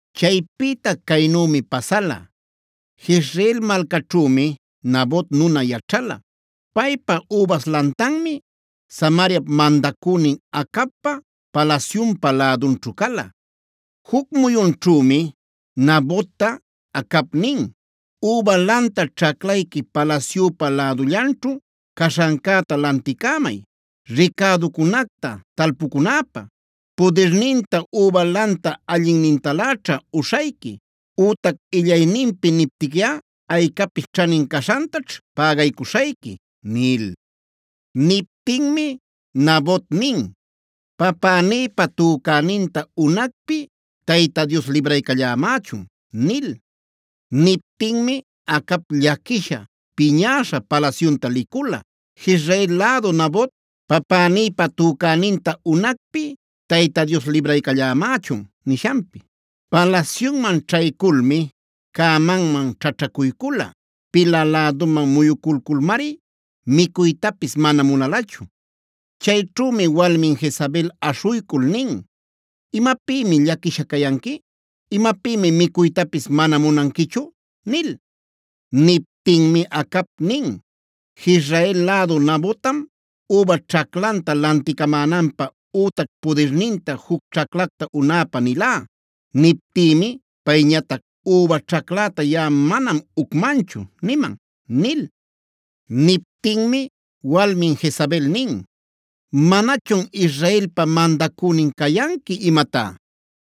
Chaypïta caynümi pasala: Jezreel malcaćhümi Nabot nuna yaćhala. Paypa übas lantanmi Samariap mandacünin Acabpa palasyunpa lädunćhu cala. Juc muyunćhümi Nabotta Acab nin: “Üba lanta ćhaclayqui palasyüpa lädullanćhu caśhancäta lanticämay, ricäducunacta talpucunäpä. Pudirninta üba lanta allinnintaläćha uśhayqui ütac illayninpi niptiquiꞌa aycapis ćhanin caśhantaćh pägaycuśhayqui” nil. Niptinmi Nabot nin: “Papänïpa tücäninta unacpi Tayta Dios libraycallämächun” nil. Niptinmi Acab llaquisha, piñäśha palasyunta licula, Jezreel lädu Nabot: “Papänïpa tücäninta unacpi Tayta Dios libraycallämächun” nishanpi. Palasyunman ćhayculmi cämanman ćhaćhacuycula. Pila läduman muyuculculmari micuytapis mana munalachu. Chayćhümi walmin Jezabel aśhuycul nin: “¿Imapïmi llaquisha cayanqui? ¿Imapïmi micuytapis mana munanquichu?” nil. Niptinmi Acab nin: “Jezreel lädu Nabottam üba ćhaclanta lanticamänanpä ütac pudirninta juc ćhaclacta unäpä nilá. Niptïmi payñatac: ‘Üba ćhacläta yaꞌa manam ucmanchu’ niman” nil. Niptinmi walmin Jezabel nin: “¿¡Manachun Israelpa mandacünin cayanqui imatá!?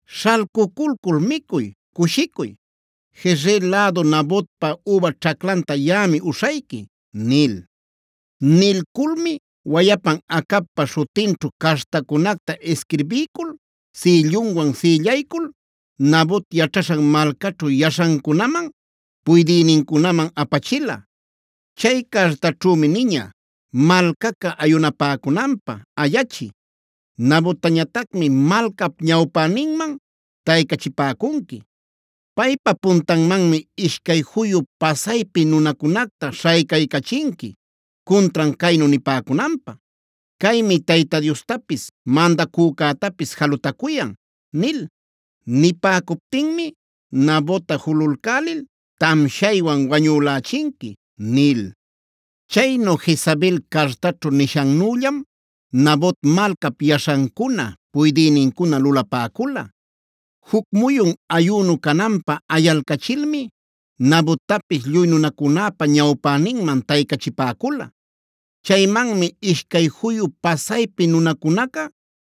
Śhalcuculcul micuy, cushicuy; Jezreel lädu Nabotpa üba ćhaclanta yaꞌami uśhayqui” nil. Nilculmi wayapan Acabpa śhutinćhu cartacunacta isquirbiycul sïllunwan sïllaycul Nabot yaćhaśhan malcaćhu yaśhancunaman, puydïnincunaman apachila. Chay cartaćhümi niña: “Malcaca ayunapäcunanpä ayachiy. Nabottañatacmi malcap ñawpäninman taycachipäcunqui. Paypa puntanmanmi ishcay juyu pasaypi nunacunacta śhaycaycachinqui cuntran caynu nipäcunanpä: ‘Caymi Tayta Diostapis mandacücätapis jalutacuyan’ nil. Nipäcuptinmi Nabotta julalcälil tamshaywan wañülächinqui” nil. Chaynu Jezabel cartaćhu nishannüllam Nabot malcap yaśhancuna, puydïnincuna lulapäcula: Juc muyun ayünu cananpä ayalcachilmi Nabottapis lluy nunacunäpa ñawpäninman taycachipäcula. Chaymanmi ishcay juyu pasaypi nunacunaca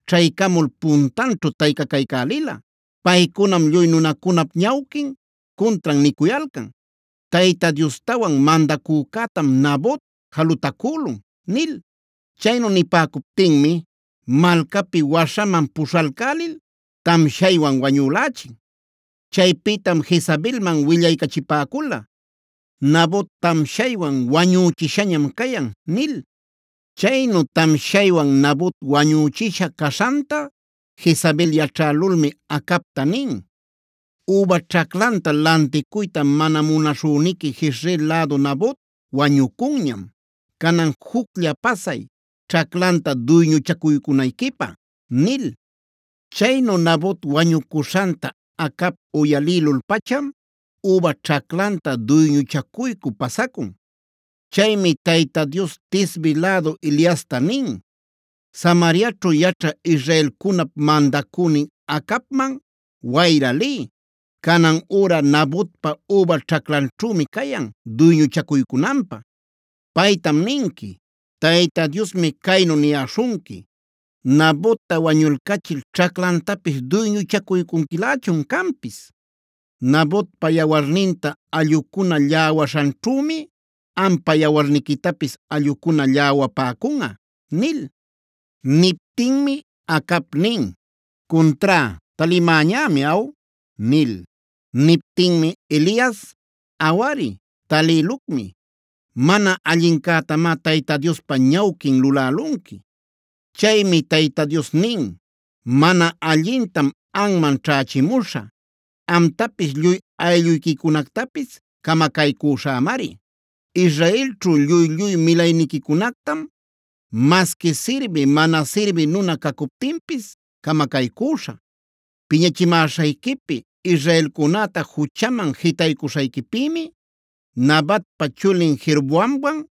ćhaycamul puntanćhu taycacaycälila. Paycunam lluy nunacunap ñawquin cuntran nicuyalcan: “Tayta Diostawan mandacücätam Nabot jalutacülun” nil. Chaynu nipäcuptinmi malcapi waśhaman puśhalcälil tamshaywan wañülächin. Chaypïtam Jezabelman willaycachipäcula: “Nabot tamshaywan wañüchishañam cayan” nil. Chaynu tamshaywan Nabot wañüchisha caśhanta Jezabel yaćhälulmi Acabta nin: “Üba ćhaclanta lanticuyta mana munaśhüniqui Jezreel lädu Nabot wañucunñam. Canan juclla pasay, ćhaclanta duyñuchacuycunayquipä” nil. Chaynu Nabot wañucuśhanta Acab uyalïlul-pacham üba ćhaclanta duyñuchacuycü pasacun. Chaymi Tayta Dios Tisbe lädu Eliasta nin: “Samariaćhu yaćhä israelcunap mandacünin Acabman wayra liy. Canan üra Nabotpa üba ćhaclanćhümi cayan duyñuchacuycunanpä. Paytam ninqui: Tayta Diosmi caynu niyäśhunqui: ‘¿Nabotta wañulcachil ćhaclantapis duyñuchacuycunquilächun canpis? Nabotpa yawarninta allꞌucuna lläwaśhanćhümi ampa yawarniquitapis allꞌucuna lläwapäcunꞌa’” nil. Niptinmi Acab nin: “Cuntrá, ¿talïmäñämi aw?” nil. Niptinmi Elias: “Awari, talïlucmi. Mana allincätamá Tayta Diospa ñawquin lulälunqui. Chaymi Tayta Dios nin: ‘Mana allintam anman ćhächimuśhä. Amtapis lluy aylluyquicunactapis camacaycüśhämari. Israelćhu lluy-lluy milayniquicunactam masqui sirbï, mana sirbï nuna cacuptinpis camacaycüśhä. Piñachimäśhayquipi, israelcunäta juchaman jitaycuśhayquipïmi Nabatpa chulin Jeroboamwan,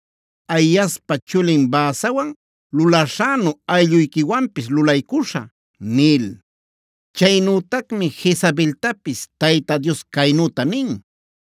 Ahiaspa chulin Baasawan lulaśhänu aylluyquiwanpis lulaycuśhä’ nil. Chaynütacmi Jezabeltapis Tayta Dios caynüta nin: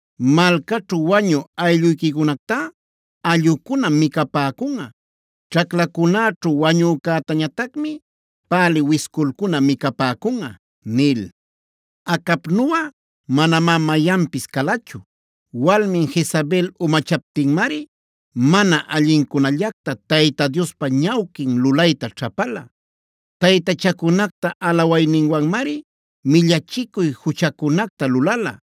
Malcaćhu wañü aylluyquicunactá allꞌucunam micapäcunꞌa. Ćhaclacunäćhu wañücätañatacmi pälï wisculcuna micapäcunꞌa” nil. (Acabnuꞌa manamá mayanpis calachu. Walmin Jezabel umachaptinmari mana allincunallacta Tayta Diospa ñawquin lulayta ćhapala. Taytachacunacta alawayninwanmari millachicuy juchacunacta lulala;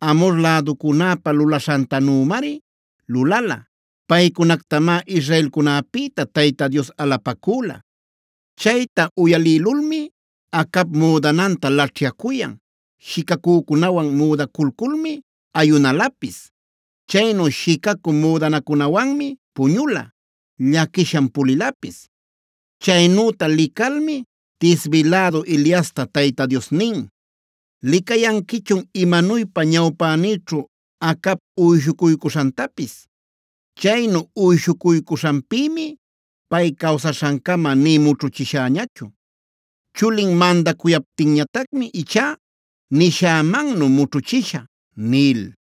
Amhor läducunäpa lulaśhantanümari lulala. Paycunactamá israelcunäpïta Tayta Dios alapacüla.) Chayta uyalïlulmi Acab müdananta laćhyacuyan, shicacücunawan müdaculculmi ayunalapis. Chaynu shicacü müdanacunawanmi puñula; llaquisham pulilapis. Chaynüta licalmi Tisbi lädu Eliasta Tayta Dios nin: “¿Licayanquichun imanuypa ñawpänïćhu Acab uyshucuycuśhantapis? Chaynu uyshucuycuśhanpïmi pay cawsaśhancama nï mućhuchishäñachu. Chulin mandacuyaptinñatacmi ichá nishämannu mućhuchishä” nil.